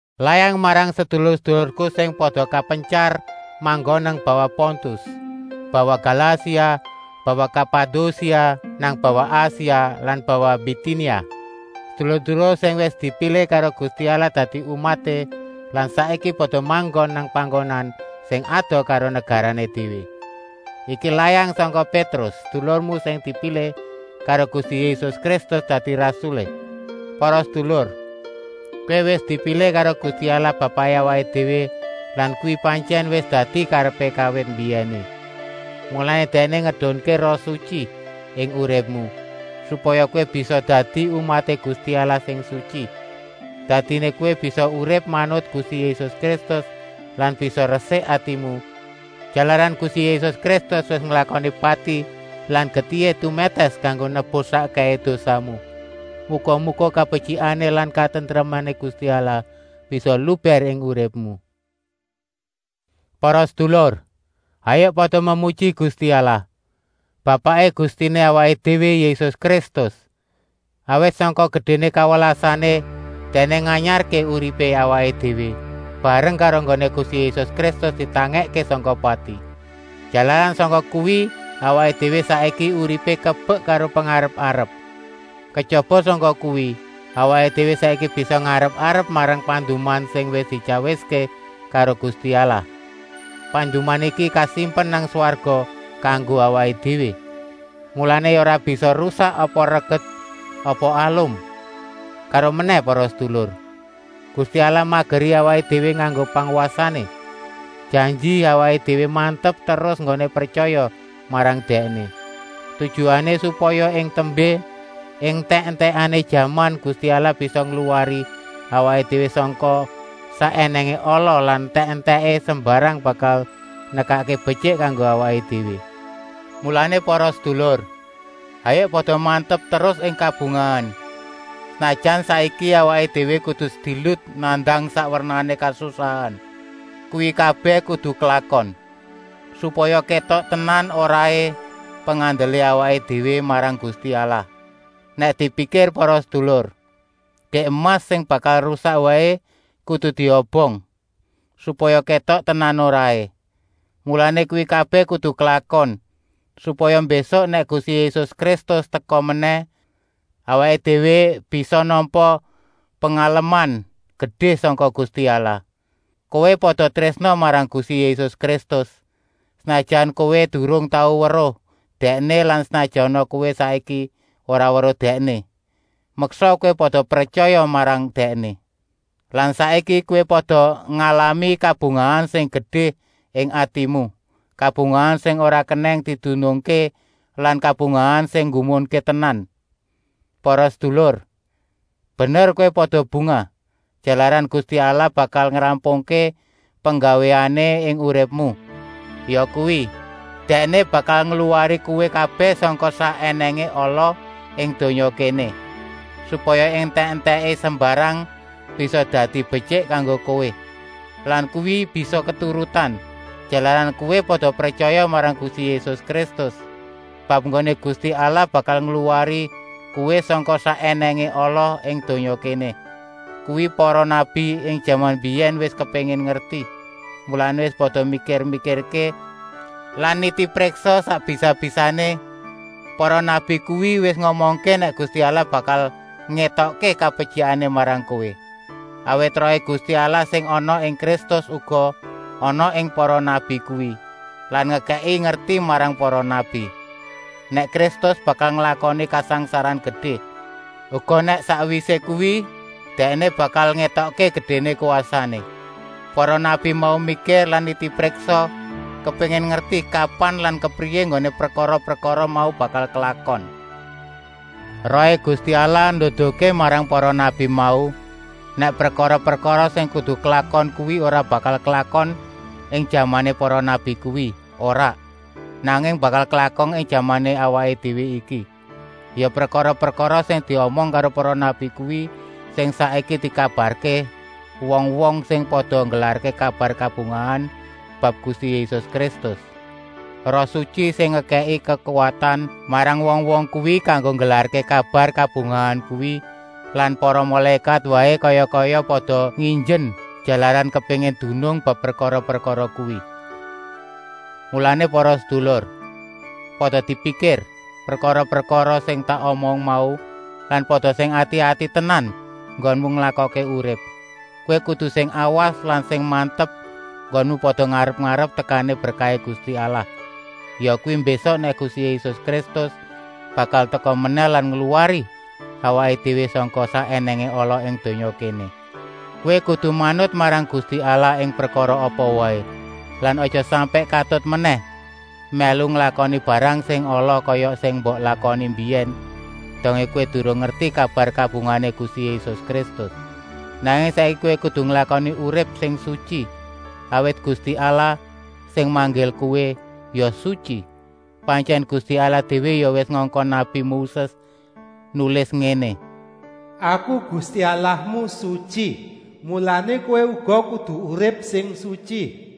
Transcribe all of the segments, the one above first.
Layang marang sedulur-sedulurku sing pada kapentyar manggon nang bawah Pontus, bawah Galasia, bawah Kapadosia, nang bawah Asia lan bawah Bitinia, sedulur-sedulur sing wis dipilih karo Gusti Allah dadi umaté lan saiki pada manggon nang panggonan sing adoh karo negarané déwé. Iki layang sangka Pétrus, sedulurmu sing dipilih karo Gusti Yésus Kristus dadi rasulé. Para sedulur, kowé wis dipilih karo Gusti Allah Bapaké awaké déwé lan kuwi pantyèn wis dadi karepé kawit mbiyèné. Mulané Dèkné ngedunké Roh Sutyi ing uripmu, supaya kowé bisa dadi umaté Gusti Allah sing sutyi. Dadiné kowé bisa urip manut Gusti Yésus Kristus lan bisa resik atimu, jalaran Gusti Yésus Kristus wis nglakoni pati lan getihé tumètès kanggo nebus sakkèhé dosamu. Muga-muga kabetyikané lan katentremané Gusti Allah bisa lubèr ing uripmu. Para sedulur, hayuk pada memuji Gusti Allah, Bapaké Gustiné awaké déwé Yésus Kristus. Awit sangka gedéné kawelasané Dèkné nganyarké uripé awaké déwé, bareng karo enggoné Gusti Yésus Kristus ditangèkké sangka pati. Jalaran sangka kuwi awaké déwé saiki uripé kebek karo pengarep-arep. Kejaba sangka kuwi, awaké déwé saiki bisa ngarep-arep marang panduman sing wis dityawiské karo Gusti Allah. Panduman iki kasimpen nang swarga kanggo awaké déwé, mulané ya ora bisa rusak apa reget apa alum. Karomenèh para sedulur, Gusti Allah mageri awaké déwé nganggo pangwasané, janji awaké déwé mantep terus enggoné pretyaya marang Dèkné. Tujuané, supaya ing tembé, ing entèk-entèkané jaman, Gusti Allah bisa ngluwari awaké déwé sangka sak ènèngé ala lan entèk-entèké sembarang bakal nekakké betyik kanggo awaké déwé. Mulané para sedulur, hayuk pada mantep terus ing kabungahan, senajan saiki awaké déwé kudu sedilut nandang sak wernané kasusahan. Kuwi kabèh kudu klakon, supaya kétok tenan-oraé pengandelé awaké déwé marang Gusti Allah. Nèk dipikir para sedulur, gèk emas sing bakal rusak waé kudu diobong, supaya kétok tenan-oraé. Mulané kuwi kabèh kudu klakon, supaya mbésuk, nèk Gusti Yésus Kristus teka menèh, awaké déwé bisa nampa pengaleman gedé sangka Gusti Allah. Kowé pada trésna marang Gusti Yésus Kristus, senajan kowé durung tau weruh Dèkné lan senajana kowé saiki ora weruh Dèkné, meksa kowé pada pretyaya marang Dèkné. Lan saiki kowé pada ngalami kabungahan sing gedé ing atimu, kabungahan sing ora kenèng didunungké lan kabungahan sing nggumunké tenan. Para sedulur, bener kowé pada bungah, jalaran Gusti Allah bakal ngrampungké penggawéané ing uripmu, yakuwi, Dèkné bakal ngluwari kowé kabèh sangka sak ènèngé ala ing donya kéné, supaya ing entèk-entèké sembarang bisa dadi betyik kanggo kowé. Lan kuwi bisa keturutan, jalaran kowé pada pretyaya marang Gusti Yésus Kristus. Bab enggoné Gusti Allah bakal ngluwari kowé sangka sak ènèngé ala ing donya kéné kuwi para nabi ing jaman mbiyèn wis kepéngin ngerti, mulané wis pada mikir-mikirké lan nitipriksa sak bisa-bisané. Para nabi kuwi wis ngomongké nèk Gusti Allah bakal ngétokké kabetyikané marang kowé. Awit Rohé Gusti Allah sing ana ing Kristus uga ana ing para nabi kuwi lan ngekèki ngerti marang para nabi, nèk Kristus bakal nglakoni kasangsaran gedé, uga nèk sakwisé kuwi Dèkné bakal ngétokké gedéné kwasané. Para nabi mau mikir lan nitipriksa kepéngin ngerti kapan lan kepriyé enggoné prekara-prekara mau bakal klakon. Rohé Gusti Allah nduduhké marang para nabi mau, nèk prekara-prekara sing kudu klakon kuwi ora bakal klakon ing jamané para nabi kuwi, ora, nanging bakal klakon ing jamané awaké déwé iki. Ya prekara-prekara sing diomong karo para nabi kuwi sing saiki dikabarké wong-wong sing pada nggelarké kabar kabungahan bab Gusti Yésus Kristus. Roh Sutyi sing ngekèki kekuwatan marang wong-wong kuwi kanggo nggelarké kabar kabungahan kuwi lan para mulékat waé kaya-kaya pada nginjen, jalaran kepéngin dunung bab prekara-prekara kuwi. Mulané para sedulur, pada dipikir prekara-prekara sing tak omong mau lan pada sing ati-ati tenan enggonmu nglakokké urip. Kowé kudu sing awas lan sing mantep enggonmu pada ngarep-arep tekané berkahé Gusti Allah, yakuwi mbésuk nèk Gusti Yésus Kristus bakal teka menèh lan ngluwari awaké déwé sangka sak ènèngé ala ing donya kéné. Kowé kudu manut marang Gusti Allah ing prekara apa waé lan aja sampèk katut menèh mèlu nglakoni barang sing ala kaya sing mbok lakoni mbiyèn dongé kowé durung ngerti kabar kabungahané Gusti Yésus Kristus. Nanging saiki kowé kudu nglakoni urip sing sutyi, awit Gusti Allah, sing manggil kowé, ya sutyi. Pantyèn Gusti Allah déwé ya wis ngongkon nabi Moses nulis ngéné: “Aku, Gusti Allahmu, sutyi, mulané kowé uga kudu urip sing sutyi.”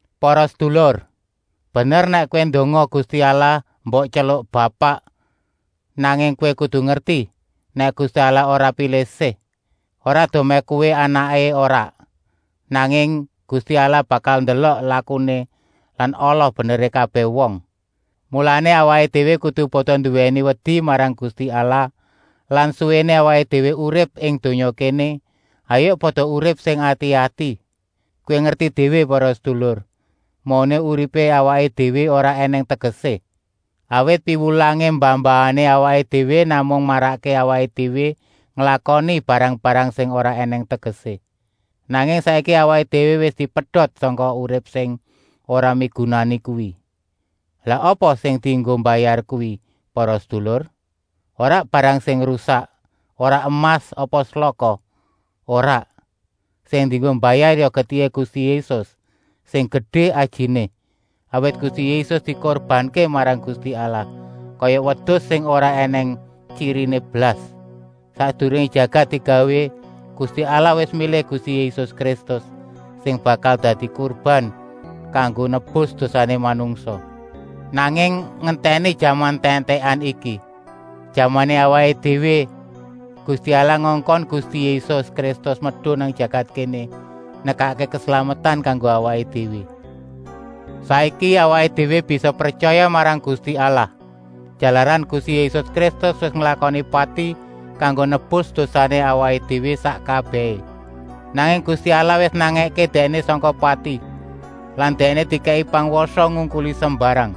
Para sedulur, bener nèk kowé ndonga Gusti Allah mbok tyeluk “Bapak.” Nanging kowé kudu ngerti nèk Gusti Allah ora pilih-sih, ora dumèh kowé anaké, ora, nanging Gusti Allah bakal ndelok lakuné lan ala-beneré kabèh wong. Mulané awaké déwé kudu pada nduwèni wedi marang Gusti Allah lan suwéné awaké déwé urip ing donya kéné, hayuk pada urip sing ati-ati. Kowé ngerti déwé para sedulur, mauné uripé awaké déwé ora ènèng tegesé, awit piwulangé mbah-mbahané awaké déwé namung marakké awaké déwé nglakoni barang-barang sing ora ènèng tegesé. Nanging saiki awaké déwé wis dipedot sangka urip sing ora migunani kuwi. Lah apa sing dienggo mbayar kuwi para sedulur? Ora barang sing rusak, ora emas apa selaka, ora. Sing dienggo mbayar ya getihé Gusti Yésus, sing gedé ajiné. Awit Gusti Yésus dikurbanké marang Gusti Allah, kaya wedus sing ora ènèng tyiriné blas. Sakdurungé jagat digawé, Gusti Allah wis milih Gusti Yésus Kristus, sing bakal dadi kurban kanggo nebus dosané manungsa. Nanging ngentèni jaman entèk-entèkan iki, jamané awaké déwé, Gusti Allah ngongkon Gusti Yésus Kristus medun nang jagat kéné nekakké keslametan kanggo awaké déwé. Saiki awaké déwé bisa pretyaya marang Gusti Allah, jalaran Gusti Yésus Kristus wis nglakoni pati kanggo nebus dosané awaké déwé sak kabèhé. Nanging Gusti Allah wis nangèké Dèkné sangka pati lan Dèkné dikèki pangwasa ngungkuli sembarang,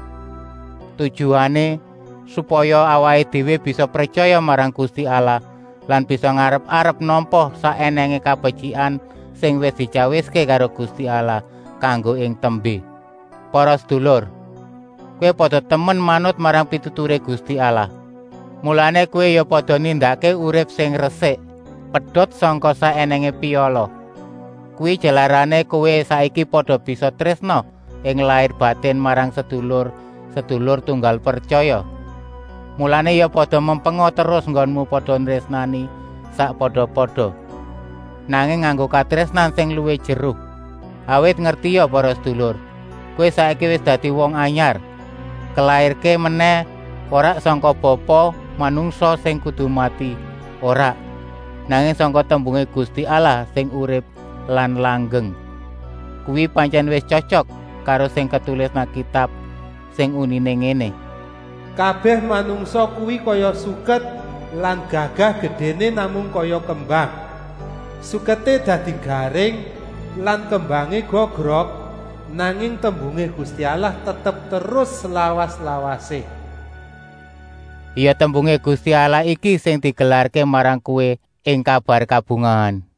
tujuané, supaya awaké déwé bisa pretyaya marang Gusti Allah lan bisa ngarep-arep nampa sak ènèngé kabetyikan sing wis dityawiské karo Gusti Allah kanggo ing tembé. Para sedulur, kowé pada temen manut marang pituturé Gusti Allah, mulané kowé ya pada nindakké urip sing resik, pedot sangka sak ènèngé piala. Kuwi jalarané kowé saiki pada bisa trésna ing lair-batin marang sedulur-sedulur tunggal pretyaya, mulané ya pada mempenga terus enggonmu pada nrésnani sakpada-pada, nanging nganggo katrésnan sing luwih jeru. Awit ngertia para sedulur, kowé saiki wis dadi wong anyar, kalairké menèh, ora sangka bapa manungsa sing kudu mati, ora, nanging sangka tembungé Gusti Allah sing urip lan langgeng. Kuwi pantyèn wis tyotyok karo sing ketulis nang Kitab sing uniné ngéné: “Kabèh manungsa kuwi kaya suket lan gagah-gedéné namung kaya kembang. Suketé dadi garing lan kembangé gogrok, nanging tembungé Gusti Allah tetep terus slawas-lawasé.” Ya tembungé Gusti Allah iki sing digelarké marang kowé ing kabar kabungahan.